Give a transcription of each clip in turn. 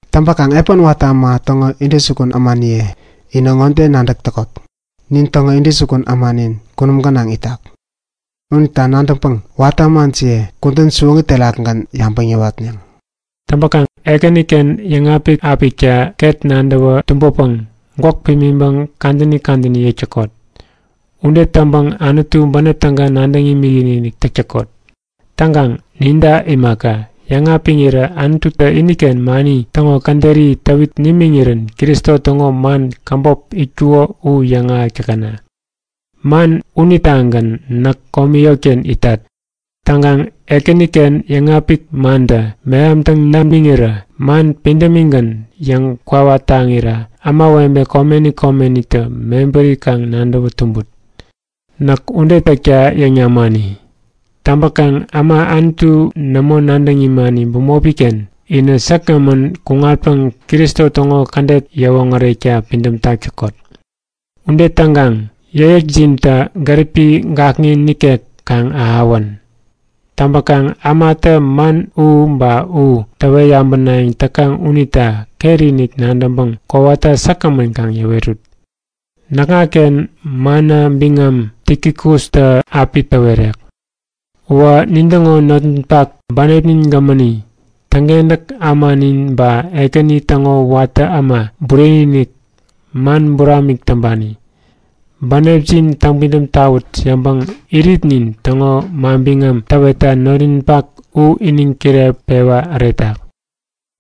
Täŋpäkaŋ epän watä äma täŋo intäjukun ämaniye, inä ŋode nadäk täkot; Nin täŋo intäjukun ämanin kunum gänaŋ itak. Unita nadäŋpäŋ watä ämajiye kudän siwoŋi terakgän yabäŋ yäwatneŋ. Täŋpäkaŋ Ekäniken yäŋapik-apikta ket nadäwä tumbäpäŋ gwäk pimiŋpäŋ kadäni kadäni yäk täkot. Ude täŋpäŋ Anutu bänep täga nadäŋ imikinik täk täkot. Täŋkaŋ ninta imaka, yäŋapiŋirä Anututä iniken mani täŋo käderi täwit nimiŋirän Kristota man käbop itkuko u yäŋahäk täkäna. Man unitagän näk komi yotken itat. Täŋkaŋ Ekäniken yäŋapik mantä mehamtäŋ namiŋirä man pidämigän yäŋkwawa taŋira ämawebe komeni komenitä mebäri kaŋ nadäwä tumbut. Näk ude täkta yäŋ namani. Täŋpäkaŋ äma Anutu nämo nadäŋ imani bämopi-ken inä säkgämän kuŋatpäŋ Kristo täŋo kädet yäwoŋärekta pidämtak täkot. Ude täŋkaŋ yäkyäkjintä gäripi gakŋi nikek kaŋ ahäwän. Täŋpäkaŋ ämatä man u ba u täwet yabänayäŋ täkaŋ unita ketinik nadäŋpäŋ kowata säkgämän kaŋ yäwerut. Näkŋaken manna biŋam Tikikustä api täwerek. Uwä nintäŋo notninpak bänepnin gämäni, täŋkentäk ämanin ba Ekäni täŋo watä piä äma bureni-inik, man buramik täŋpani. Bänepjin täŋpidäm tawut yäŋpäŋ iritnin täŋo manbiŋam täwetta notninpak u iniŋ kireŋpewa äretak.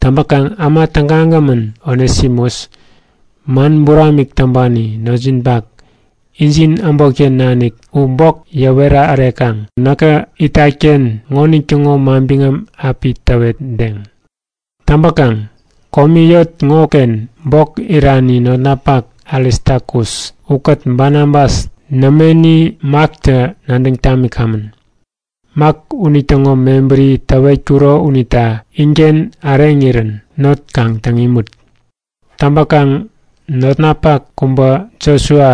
Täŋpäkaŋ äma tägagämän Onesimus, man buramik täŋpani notjinpak, injin äbotken nanik u bok yäwera äreŋkaŋ näkä itat-ken ŋonitäŋo manbiŋam api täwetdeŋ. Täŋpäkaŋ komi yot ŋoken bok irani notnapak Aristakus ukät Banabas nämeni Maktä nadäŋ tamikamän. (Mak unitäŋo mebäri täwetkuro unita inken äreŋirän not kaŋ täŋ imut.) Täŋpäkaŋ notnapak kubä Josua,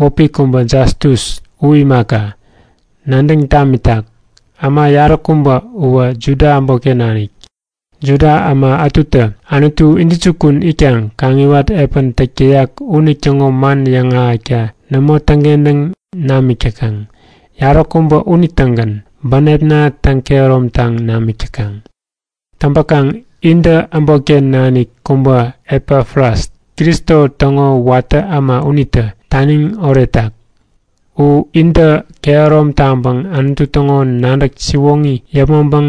wäpi kubä Jastus u imaka, nadäŋ tamitak. Äma yaräkubä uwä Juda äbotken nanik. Juda äma ätutä Anutu intäjukun itkaŋ kaŋiwat epän täk täyak unitäŋo man yäŋahäkta nämo täŋkentäŋ namik täkaŋ, yaräkubä unitägän bänepna täŋ-kehäromtaŋ namik täkaŋ. Täŋpäkaŋ intä äbotken nanik kubä Epafras, Kristo täŋo watä piä äma unitä taniŋ oretak. U intä kehärom taŋpäŋ Anutu täŋo nadäk siwoŋi yäpmäŋpäŋ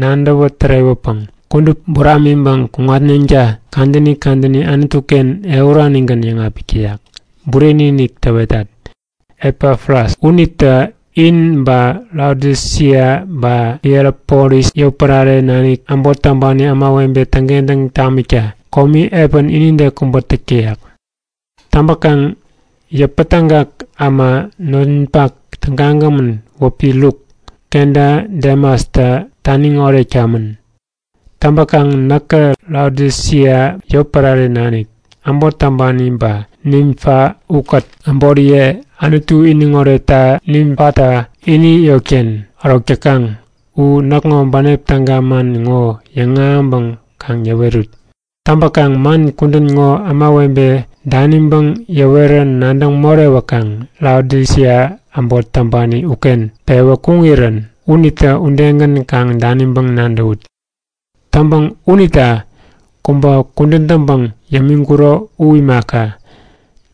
nadäwä-tärewäpäŋ kudup buramiŋpäŋ kuŋatneŋta kadäni kadäni Anutu-ken ehuranigän yäŋapik täyak. Bureni-inik täwetat; Epafras unitä in ba Laodisia ba Hierapolis yotpärareken nanik äbot täŋpani ämawebe täŋkentäŋ tamikta komi epän inide kubä täk täyak. Täŋpäkaŋ yäpätägak äma notninpak tägagämän wäpi Luk kenta Demastä taniŋ oretkamän. Täŋpäkaŋ näkä Laodisia yotpärareken nanik äbot täŋpani ba Nimfa ukät äboriye Anutu iniŋ oretta Nimfatä ini yotken ärok täkaŋ u näkŋo bänep täga man ŋo yäŋahäŋpäŋ kaŋ yäwerut. Täŋpäkaŋ man kudän ŋo ämawebe daniŋpäŋ yäwerä nadäŋ morewäkaŋ Laodisia äbot täŋpani uken pewä kuŋirän unitä udegän kaŋ daniŋpäŋ nadäwut. Täŋpäŋ unita kubä kudän täŋpäŋ yämiŋkuro u imaka,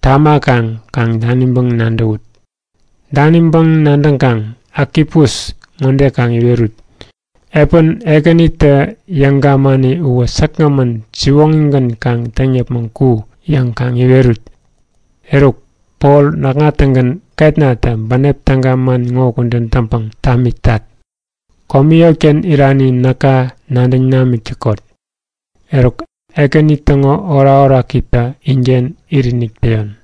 tamäkaŋ kaŋ daniŋpäŋ nadäwut. Daniŋpäŋ nadäŋkaŋ Akipus ŋode kaŋ iwerut; Epän Ekänitä yäŋ gamani uwä säkgämän siwoŋigän kaŋ täŋ yäpmäŋ ku yäŋ kaŋ iwerut. Eruk, Pol näkŋa-tägän ketnatä bänep täga man ŋo kudän täŋpäŋ tamitat. Komi yotken irani näka nadäŋ namik täkot. Eruk, Ekäni täŋo orakorakitä inken itinik täyon.